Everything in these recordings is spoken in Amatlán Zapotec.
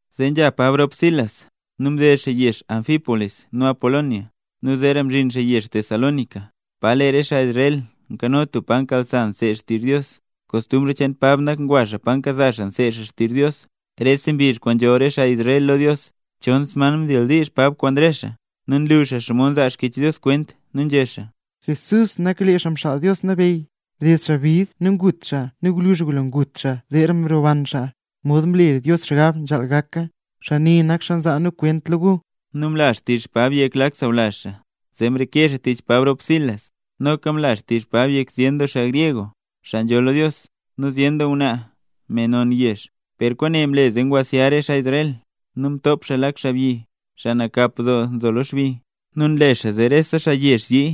Zee nzha Pab rop Silas, nu mded xaa yezh Anfípolis nu Apolonia, nu zeera mzhin xaa yezh Tesalónica, pa lee re xaa Israel nkano tub pa nkasa xaa nseed xtizh xaa Dios. Kostumbr cheen Pab nak ngwa xaa pa nkasa xaa nseed xaa xtizh Dios, rese mbizh kwaan nzhool re xaa Israel lo Dios. Chon sman mdildiizh Pab kwaan re xaa. Nu nlu xaa xomod nzaa Xkyech Dios kwent, nu nzhé xaa: —Jesús nak lee Xaa Mxaal Dios Nabeyy, mded xaa bid nu ngut xaa nu gwluzh ngulo ngut xaa zeera mroban xaa, mod mlela Dios xgab nzhaal gak xaa. Xaa ne nza na kwent cheen lo gu. Nu mla xtizh Pab yek lak sawlazh xaa, zee mreke xaa tich Pab rop Silas. Noka mla xtizh Pab yek zyen doo xaa gryeg, xaa nzholl lo Dios, nu zyen doo ngwnaa, me non yezh. Per kwaane mle ngwasya re xaa Israel, nu mtop xaa lak xaabyi, xaa nakap doo nzo lo xbi, nu nle xaa zee rese xaa yezh yii.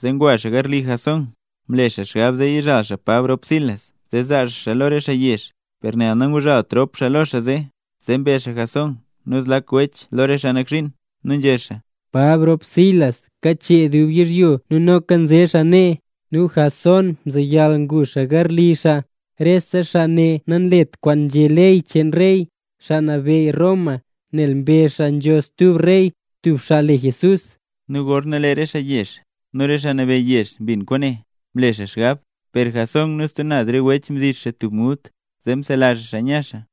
Zee ngwa xaa garli Jasón, mle xaa xgab zee yizhal Pab rop Silas zee zaa xaa xaa lo re xaa yezh. Per nel nanguzhalt rop xaa lo xaa zee, zee mbe xaa Jasón nu zlak wech lo re xaa nak zhiin, nu nzhé xaa: —¡Pab rop Silas kachee dub yizhyo nu noka nze xaa nee, nu Jasón mzeyal ngu xaa garli xaa! Rese xaa ne nanlet kwaan nzhé ley cheen rey, xaa nabeyy Roma, nel mbezh xaa nzho stub rey, tub xaa le Jesús. Nu gorna lee re xaa yezh nu re xaa nabeyy yezh mbin kwaane, mle xaa xgab. Per Jasón nu stub naz re wech mdix xaa tub mult zee msela xaa xaa nya xaa.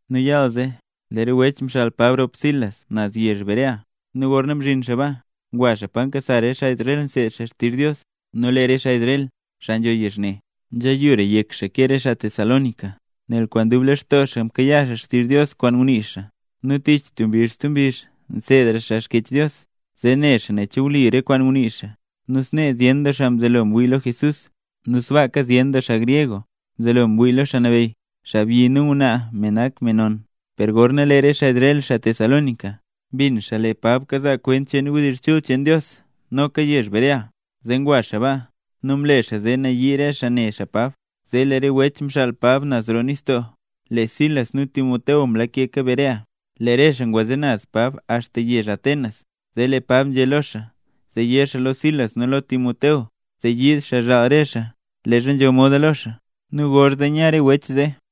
Nu yaal zee, lee re wech mxaal Pab rop Silas naz yezh Berea. Nu gorna mzhin xaa baa, ngwa xaa pa nkasa xaa Israel nseed xaa xtizh Dios. Nu lee re xaa Israel, xaa nzho yezh ne, nzheyura yek xaa ke re xaa Tesalónica, nel kwaan dub lextoo xaa mkayaa xaa xtizh Dios kwaan ngunii xaa, nu tich tub mbizh stub mbizh nseedra xaa Xkyech Dios zee ne xaa nen che wli re kwaan ngunii xaa. Nu snee zyen doo xaa mzelo ngwii lo Jesús, nu sbaaka zyen doo xaa gryeg mzelo ngwii lo Xaa Nabeyy, xaabyi nu ngwnaa me nak me non. Per gorna lee re xaa Israel, xaa Tesalónica, mbin xaa lee Pab kazaa kwent cheen wdizh chul cheen Dios noka yezh Berea, zee ngwa xaa baa nu mle xaa zee nayii re xaa ne xaa Pab. Zee lee re wech mxaal Pab naz roo nistoo, lee Silas nu Timoteo mlakeka Berea. Lee re xaa ngwaze naz Pab axta yezh Atenas. Zee lee Pab nzhé lo xaa zee yé xaa lo Silas nu lo Timoteo zee yiid xaa zhaal re xaa leezha nzho moda lo xaa. Nu gorzee nya re wech zee.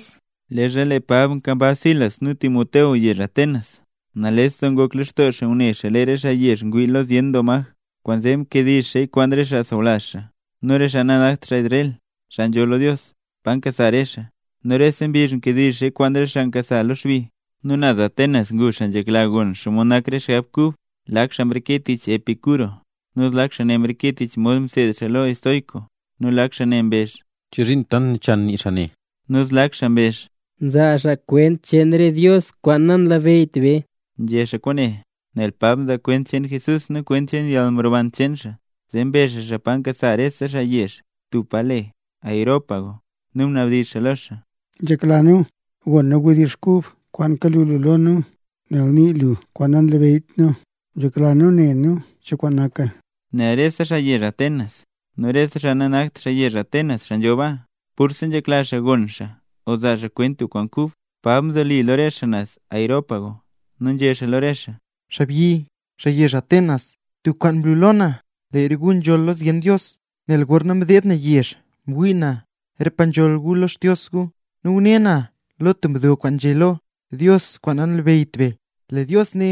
Leezha lee Pab nkambaz Silas nu Timoteo yezh Atenas, nales doo ngok lextoo xaa ngune xaa lee re xaa yezh ngwii lo zyen maj. Kwaanzee mkediizh xaaya kwaan re xaa sawlazh xaa nu re xaa nanakt xaa Israel, xaa nzholl lo Dios, pa nkasa re xaa. Nu rese mbizh nkediizh xaaya kwaan re xaa nkasa lo xbi. Nu naz Atenas ngu xaa nzhekla gon xomod nak rese xgab kub. Lak xaa ne mreke tich Epicuro, nu zlak xaa ne mreke tich mod mseed xaa estoico, nu lak xaa ne mbezh: —¿Chozhiin tant nachan nii xaa ne? Nu zlak xaa mbezh: —Nzaa xaa kwent cheen re dios kwaan nanlabeyyt be. Nzhé xaa kwaane nel Pab nzaa kwent cheen Jesús nu kwent cheen yalmroban cheen xaa. Zee mbe xaa xaa pa nkasa rese xaa yezh, tub pa le Areópago, nu mnabdizh xaa lo xaa: —Nzhekla nu gon nu wdizh kub kwaan kalu lu lo nu. Nel nii lu kwaan nanlabeyyt nu, nzhekla nu ne nu cho kwaan naka. Nal rese xaa yezh Atenas, nu re xaa nanakt xaa yezh Atenas xaa nzho baa, purse nzhekla xaa gon xaa o zaa xaa kwent tub kwaan kub. Pab mzoli lo re xaa naz Areópago, nu nzhé xaa lo re xaa: —Xaabyi, xaa yezh Atenas, tub kwaan mlu lo na, lee re gu nzholl lo zyen dios. Nel gorna mdeed na yezh, mwii na re pa nzholl gu lo re xdios gu, nu ngune na lo tub mdo kwaan nzhé lo: “DIOS KWAAN NANLABEYYT BE”. Lee Dios ne,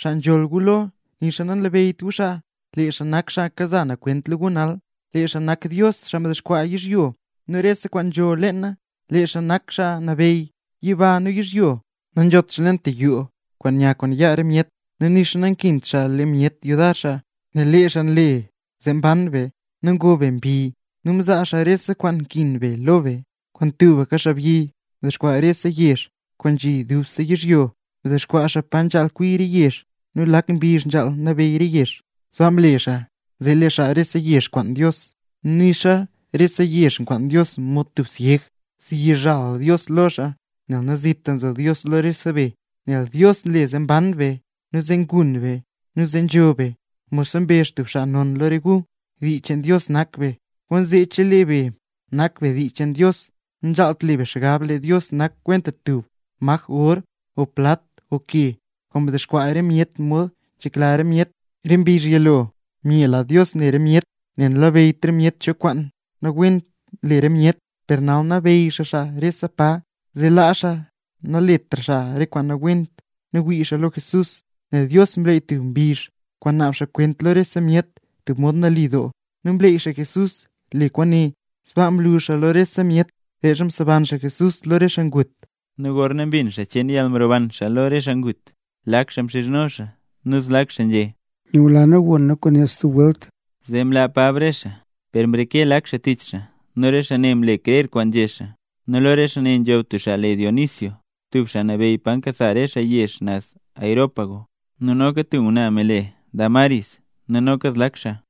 xaa nzholl gu lo, nixa nanlabeyyt gu xaa, lee xaa nak xaa kaza na kwent lo gu nal. ’Lee xaa nak Dios, xaa mdexkwaa yizhyo nu rese kwaan nzho leena, lee xaa nak Xaa Nabeyy yiba nu yizhyo. Nanzhot xaa leen tub yoo kwaan nya kwaan yaa myet, nu nixa nankint xaa le myet yudar xaa, nel lee xaa nak xaa nle zee ban be nu ngob be mbi, nu nzaa xaa rese kwaan nkin be lo be. ’Kwaan tubka xaabyi mdexkwaa xaa rese yezh kwaan nzhi lo dubse yizhyo; mdexkwaa xaa pa nzhaal kwi re yezh nu lak mbizh nzhaal nabeyy re yezh. Sbaa mle xaa, zee lee xaa rese yezh kwaan Dios. Nu nixa xaa rese yezh nkwaan Dios mod tub syeg, zyizhal Dios lo xaa, nel nazit nzo xaa lo rese be. Nel Dios nle zee mban be, nu zee ngun be, nu zee nzho be. Modxa mbezh tub xaa non lo re gu: “Dii cheen Dios nak be”. Kwaanzee chelee be nak be dii cheen Dios, nanzhaalt lee be xgab lee Dios nak kwenta tub maj or o plat o ke, kwaan ngaxkwaa re myet mod nzhekla re myet. Re mbizh yilo myela Dios ne re myet, nel namlabeyyt re myet cho kwaan nawent nle re myet, per nal nabeyy xaa xaa rese pa, zee laa xaa naletra xaa kwaan nawent nu wii xaa lo Jesús. Nel Dios mleey tub mbizh kwaan naab xaa re kwent lo rese myet tub mod nali doo, nu mleey xaa Jesús le kwaane. Sbaa mlu xaa lo rese myet, leezha mseban xaa Jesús lo re xaa ngut. Nu gorna mbin xaa cheen kwaan mroban xaa lo re xaa ngut, lak xaa mxizhno xaa nu zlak xaa nzhé: —Nyula nu gon nu kwaane stub welt. Zee mlaa Pab re xaa. Per mreke lak xaa tich xaa nu re xaa ne mle krer kwaan nzhé xaa. Nu lo re xaa ne nzho tub xaa le Dionisio, tub xaa nabeyy pa nkasa rese xaa yezh naz Areópago, nu noka tub ngwnaa me le Dámaris, nu noka zlak xaa.